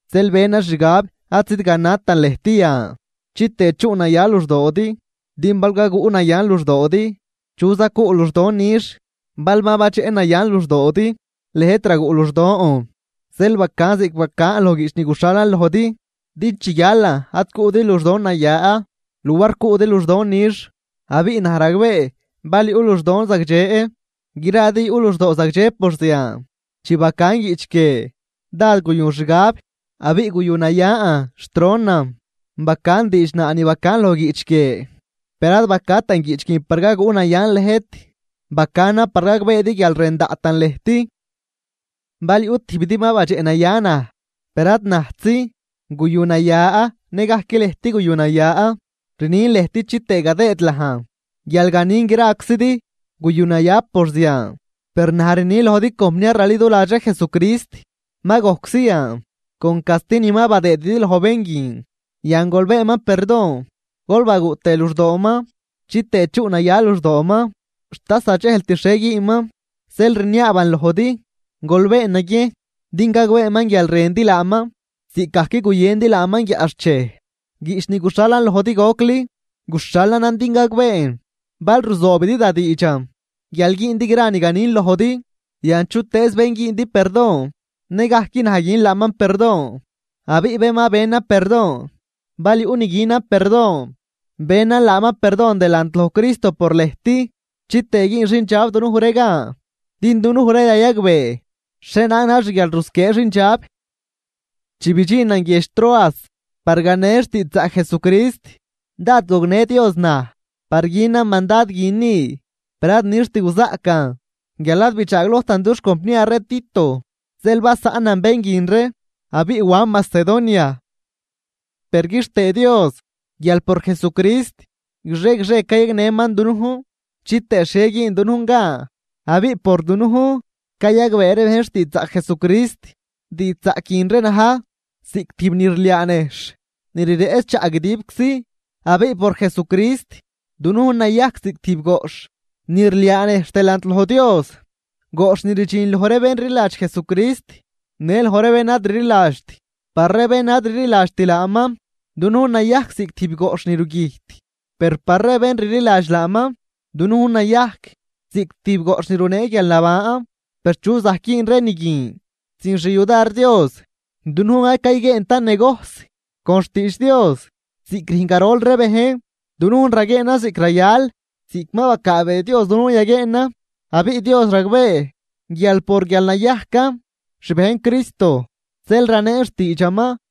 Zeel benan xgab ad zidganatan lëjt yan, chitëë chuꞌnaya luxdoodi. Din bal gaguꞌnayan luxdoodi, ¿chuza cuꞌ luxdon nix bal ma badxeꞌnayan luxdoodi lëjt raguꞌ luxdon? Zeel bacan ziꞌc bacan loj guiꞌch ni guxhalan lojdi, din chi guialan ad cuꞌdi luxdon naya luar cuꞌdi luxdon nix. Abiꞌ naj ragbee bal yuꞌ luxdon zagdxe gradi yuꞌ luxdoo zagdxe por zian. Chi bacan guiꞌch guie dád guyun xgab abiꞌ guyunayan xt ronan bacan diidxnaa ni bacan loj guiꞌch guie, per ad bacatan guiꞌch guin par gaguꞌnayan lëjt, bacanan par gagbeedi guial rën daꞌtan lëjt. Bal yuꞌ tijbidi ma badxeꞌnaya naj, per ad najtzi guyunaya nëgajc lëjt guyunaya. Rnin në lëjt chitëë gadëëdlajn guial ganin graczidi guyunaya por zian. Per naj rni lojdi compniar raliduladx ree Jesucrist, ma gojczi yan con casti ni ma badëëdidi loj bén guin. Yan gol beenman perdon gol baguꞌ tëë luxdooman chitëë chuꞌnaya luxdooman xt ad zadxejlt xhie güünman. Zeel rniaaban lojdi, gol been naguiejn din gagbeeman guial rëndi laaman ziꞌcgajc guyëndi laaman guiaꞌxchej. Guiꞌch ni guxhalan lojdi gocli, guxhalanan din gagbeen bal ruzoobidi da diidxan guial güündi gra ni ganin lojdi. Yan chutëëz bén güündi perdon, nëgajc naj gün laaman perdon. Abiꞌ bén ma benan perdon, bal yuꞌ ni günan perdon, benan laaman perdon delant loj Cristo por lëjt chitëë güün xindxab dunuj ree gan, din dunuj ree rayagbee xhienaag na̱j xguialrusquiee xindxab. Chi bidxinan guiedx Troas par ganen xtiidxzaꞌc Jesucrist, dád gognë Dios naj par günan mandad guin ni. Per ad nixt guzaꞌcan guial ad bidxaaglojtan dux compniar ree Tito. Zeel basaꞌnan bén guin ree abiꞌ wan Macedonia. Per quixtëë Dios guial por Jesucrist guixie guixie cayagnëman dunujn chitëë xhie güün dunujn gan abiꞌ por dunujn cayagbee ree bejn xtiidxzaꞌc Jesucrist, diidxzaꞌc guin ree na̱j ziꞌc tijb ni rliaa nejxh ni rireꞌch chaꞌ guidibczi. Abiꞌ por Jesucrist dunujn nayajc ziꞌc tijb goꞌxh ni rliaa nejxh delant loj Dios, goꞌxh ni rdxin loj ree bén rliladx Jesucrist në loj ree bén ad rliladxt. Par ree bén ad rliladxt laaman, dunujn nayajc ziꞌc tijb goꞌxh ni rugüjt, per par ree bén rliladx laaman dunujn nayajc ziꞌc tijb goꞌxh ni runee guialnaban. Per, ¿chu zajc güün ree ni guin sin xyudar Dios? Dunujn ad cayguieentan negojs con xtiidx Dios ziꞌc rüjn garol ree bejn, dunujn raguieenan ziꞌc rayal, ziꞌc ma bacaabee Dios dunujn yaguieenan. Abiꞌ Dios ragbee guial por guial nayajcan xbejn Cristo zeel raneen xtiidxaman.